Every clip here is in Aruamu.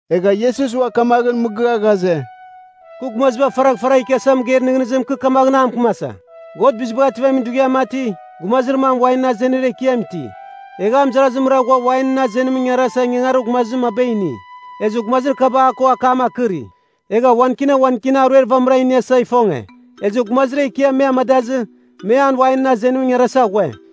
Egha Iesus ua kamaghɨn mɨgɨa ghaze, “Kɨ gumaziba faragh faragh ikiasa mɨgeir nɨghnɨzim kɨ kamaghɨn a mɨkɨmasa. God Bizibagh Ativamin Dughiam mati, gumazir mam wainɨn azenir ekiam iti. Egha a mɨzarazimra ghua wainɨn azenimɨn ingarasa ingangarir gumazir maba ini. Ezɨ gumazir kaba a ko akam akɨri, egha wan kina wan kina aruer vamɨra iniasa ifonge, ezɨ gumazir ekiam me amadazɨ me an wainɨn azenimɨn ingarasa ghue.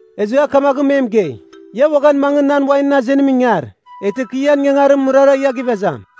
Ezɨ a kamaghɨn me mɨgei, ‘Ia uaghan mangɨ nan wainɨn azenimɨn ingar, eghtɨ kɨ ian ingangarimɨn mɨrara ia gɨvezam.’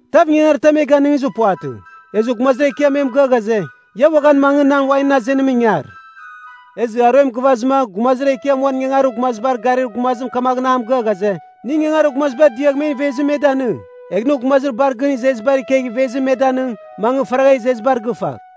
‘Tav ingangaritam e ganɨngizir puvatɨ.’ Ezɨ gumazir ekiam me mɨgɨa ghaze, ‘Ia uaghan mangɨ nan wainɨn azenimɨn ingar.’ “Ezɨ aruem gɨvazɨma gumazir ekiam uan ingangarir gumazibar garir gumazim kamaghɨn a mɨgɨa ghaze, ‘Nɨ ingangarir gumazibar diagh men ivezim me danɨng. Egh nɨ gumazir bar gɨn izezibar ikegh ivezim me danɨng, mangɨ faragha izezibar gɨfagh.’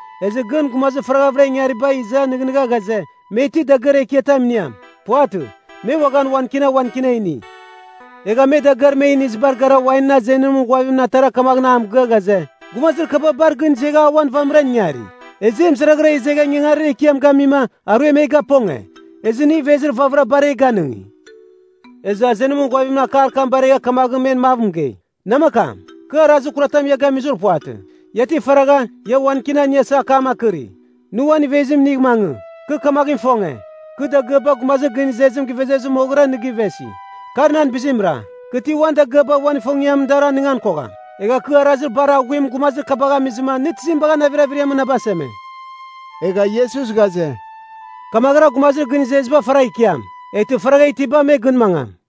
Ezɨ gɨn gumazir faraghavɨra ingariba iza nɨghnɨgha ghaze, me ti dagɨar ekiatam iniam. Puvatɨ, me uaghan wan kina wan kina ini. Egha me dagɨar me inizibar gara wainɨn azenimɨn ghuavimɨn atara kamaghɨn a mɨgɨa ghaze, ‘Gumazir kaba bar gɨn izegha auan vamɨran ingari, ezɨ e mɨzaraghara izegha ingangarir ekiam gamima, aruem e gaponge. Ezɨ nɨ ivezir vamɨra bar e ganɨngi.’ “Ezɨ azenimɨn ghuavim akar kam baregha kamaghɨn men mav mɨgei, ‘Namakam, kɨ arazir kuratam ia gamizir puvatɨ. Ia ti faragha, ia wan kina iniasa akam akɨri? Nɨ uan ivezim inigh mangɨ. Kɨ kamaghɨn ifonge, kɨ dagɨaba gumazir gɨn izezim gɨvezir moghɨra nɨ gɨvesi. Kar nan bizimra. Kɨ ti uan dagɨaba uan ifongiamɨn dar anɨngan kogham? Egha kɨ arazir bar aghuim gumazir kabagh amizɨma nɨ tizim bagha navir averiamɨn na baseme?’” Egha Iesus ghaze, “Kamaghɨra gumazir gɨn izeziba faragh ikiam, eghtɨ faragha itiba me gɨn mangam.”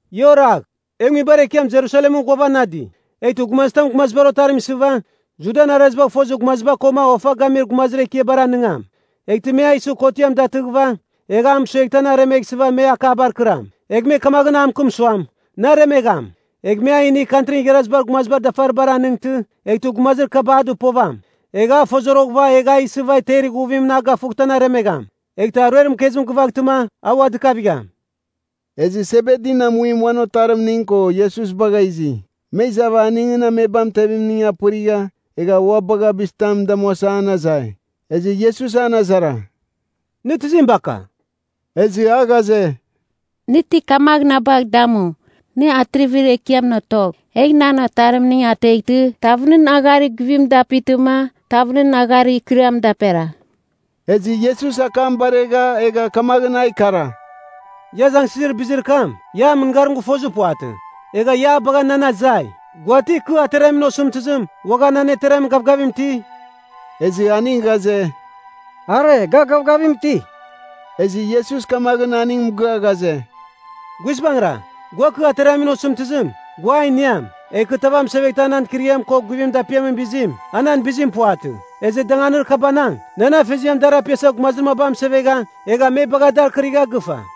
“Ia oragh, E nguibar ekiam Jerusalemɨn ghuavanadi. Eghtɨ gumazitam Gumazibar Otarim isɨva, Judan arazibagh fozir gumaziba koma ofa gamir gumazir ekiabar anɨngam. Eghtɨ me a isɨ kotiam datɨghɨva, egh a mɨsueghtɨ an aremeghsɨva me akabar kɨram, egh me kamaghɨn a mɨkɨm suam, Nɨ aremegham. Egh me a inigh Kantrin Igharazibar Gumazibar dafaribar anɨngtɨ, eghtɨ gumazir kaba a dɨpovam, egh a ifozoroghɨva egh a isɨva temer ighuvim gafughtɨ an aremegham. Eghtɨ aruer mɨkezim gɨvaghtɨma, a ua dɨkavigham.” Ezɨ Sebedin amuim uan otarimning ko Iesus bagha izi. Me izava aningɨn amebam itevimning apɨrigha, egha ua bagha bizitam damuasa an azai. Ezɨ Iesus an azara, “Nɨ tizim baka?” Ezɨ a ghaze, “Nɨ kamaghɨn na bagh damu, nɨ Atrivir Ekiamɨn otogh, egh nan otarimning ateghtɨ, tav nɨn agharir guvim dapitɨma, tav nɨn agharir ikɨriam daperagh.” Ezɨ Iesus akam baregha egha kamaghɨn a ikara, “Ia azangsɨzir bizir kam, ia an mɨngarim gɨfozir puvatɨ, egha ia a bagha nan azai. Gua ti kɨ ateramin osɨmtɨzim, uaghan an ateramin gavgavim iti?” Ezɨ aning ghaze, “Are, ga gavgavim iti.” Ezɨ Iesus kamaghɨn aning mɨgɨa ghaze, “Guizbangɨra, gua kɨ ateramin osɨmtɨzim, gua a iniam. Egha kɨ tav amɨseveghtɨ a nan ikɨriam ko guvimɨn dapiamin bizim, a nan bizim puvatɨ. Ezɨ danganir kabanang, nan Afeziam dar apiasa gumazir maba amɨsevegha, egha me bagha dar kɨrigha gɨfa.”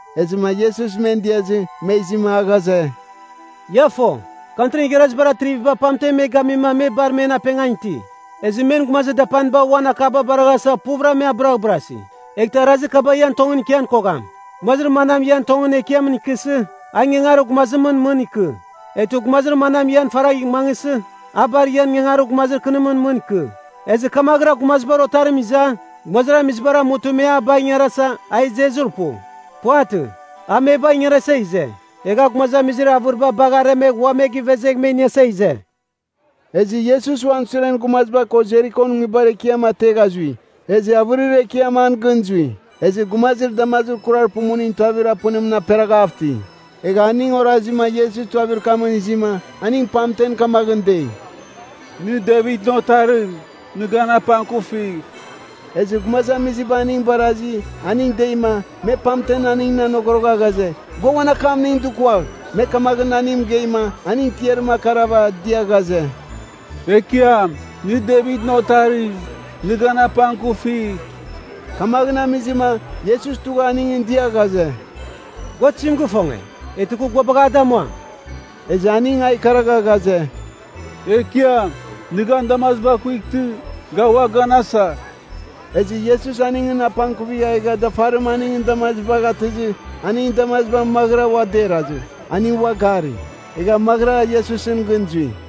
Ezɨma Iesus men diazɨ, me izima a ghaze, “Ia fo, Kantrin Igharazibar atriviba pamten me gamima, me bar men apengan iti. Ezɨ men gumazir dapaniba uan akaba baraghasa puvɨra me abɨraghbɨrasi. Eghtɨ arazir kaba ian tongɨn ikian kogham. Gumazir manam ian tongɨn ekiamɨn ikɨsɨ, a ingangarir gumazimɨn mɨn ikɨ. Eghtɨ gumazir manam ian faragh mangɨsɨ, a bar ian ingangarir gumazir kɨnimɨn mɨn ikɨ. Ezɨ kamaghɨra Gumazibar Otarim iza, gumazamizibar amutɨ me a bagh ingarasa, a izezir pu. Puvatɨ, a me bagh ingarasa ize. Egha a gumazamizir avɨriba bagh aremegh ua me givezegh me iniasa ize.” Ezɨ Iesus uan suren gumaziba ko Jerikon nguibar ekiam ategha zui. Ezɨ avɨrir ekiam an gɨn zui. Ezɨ gumazir damazir kurar pumuning tuavir apɨnimɨn aperaghav iti. Egha aning orazima Iesus tuavir kamɨn izima, aning pamten kamaghɨn dei, “Nɨ Devitɨn Otarim, nɨ gan apangkufigh.” Ezɨ gumazamiziba aning barazi, aning deima, me pamten aningɨn anogorogha ghaze, gua uan akamning dukuagh. Me kamaghɨn aningɨn mɨgeima, aning tiarim akarava dia ghaze, “Ekiam, nɨ Devitɨn Otarim, nɨ gan apangkufigh.” Kamaghɨn amizɨma, Iesus tugha aningɨn dia ghaze, “Gua tizim gifonge, eghtɨ kɨ gua bagh a damuam?” Ezɨ aning a ikaragha ghaze, “Ekiam, nɨ gan damaziba kuightɨ, ga ua ganasa.” Ezɨ Iesus aningɨn apangkuvigha egha dafarim aningɨn damazibagh atɨzɨ, aningɨn damaziba maghɨra ua derazɨ, aning ua gari. Egha maghɨra Iesusɨn gɨn zui.